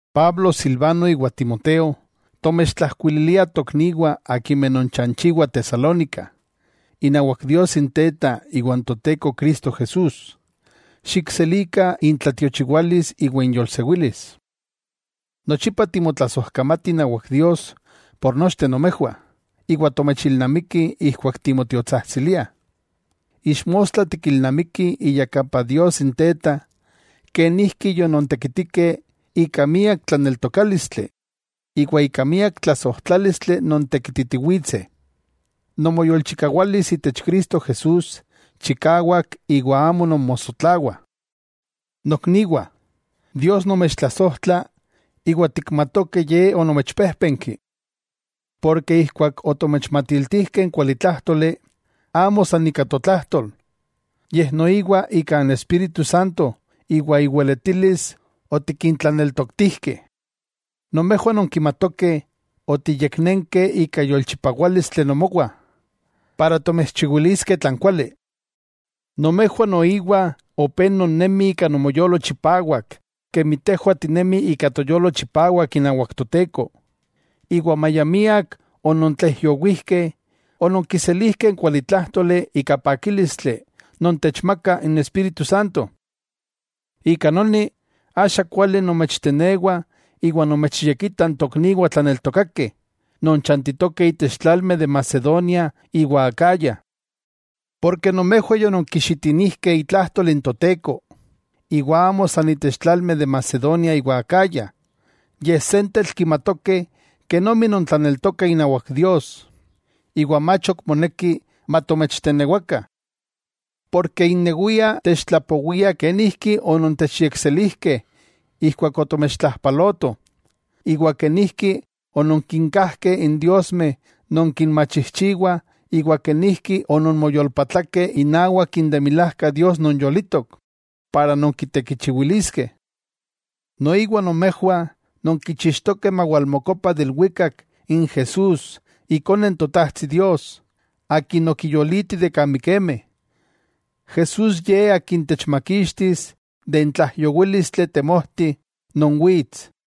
Pablo, Silvano iwa Timoteo, tomechtlajkuililiah tokniwah akimeh nonchanchiwah Tesalónica, inawak Dios n Teta iwa n Toteko Cristo Jesús: Xikselikah intlatiochiwalis iwa inyolsewilis. Nochipa timotlasojkamatih inawak Dios por nochteh nomejwah, iwa tomechilnamikih ijkuak timotiotsajtsiliah. Ixmostla tikilnamikih iyakapa Dios n Teta, kenijki yonontekitikeh ika miak tlaneltokálistli, iwa ika miak tlasojtlálistli nontekititiwitseh. Nomoyolchikawalis itech Cristo Jesús chikawak iwa amo nonmosotlawah. Nokniwah, Dios nomechtlasojtla, iwa tikmatokeh Ye onomechpéjpenki. Porke ijkuak otomechmatiltijkeh n kualitlájtoli, amo san ika totlajtol, yej noiwa ika n Espíritu Santo iwa iweletilis otikintlaneltoktijkeh. Nomejwah nonkimatokeh otiyeknenkeh ika yolchipawálistli nomowah, para tomechchiwiliskeh tlan kuali. Nomejwah noiwa opé nonnemih ika nomoyolo chipawak kemi tejwah tinemih ika toyolo chipawak inawak Toteko, iwa maya miak onontlaijyowijkeh, ononkiselijkeh n kualitlájtoli ika pakílistli non techmaka n Espíritu Santo. Ika noni, axa kuali nomechtenewah iwa nomechyekitah n tokniwah tlaneltokakeh, non chantitokeh itech tlalmeh de Macedonia iwa Acaya. Porke nomejwah yononkixitinijkeh itlajtol n Toteko, iwa amo san itech tlalmeh de Macedonia iwa Acaya, yej sentetl kimatokeh kenomi nontlaneltokah inawak Dios, iwa mach ok moneki matomechtenewakah. Porke innewiah techtlapowiah kenijki onontechyekselijkeh ijkuak otomechtlajpalotoh, iwa kenijki ononkinkajkeh n diosmeh non kinmachijchiwah iwa kenijki ononmoyolpatlakeh inawak n de milajka Dios non yolitok, para nonkitekichiwiliskeh. Noiwa nomejwah nonkichixtokeh mawalmokopa de ilwikak n Jesús Ikone n Totajtsi Dios, Akin okiyoliti de kan mikemeh. Jesús Ye Akin techmakixtis de n tlaijyowílistli temojti non wits.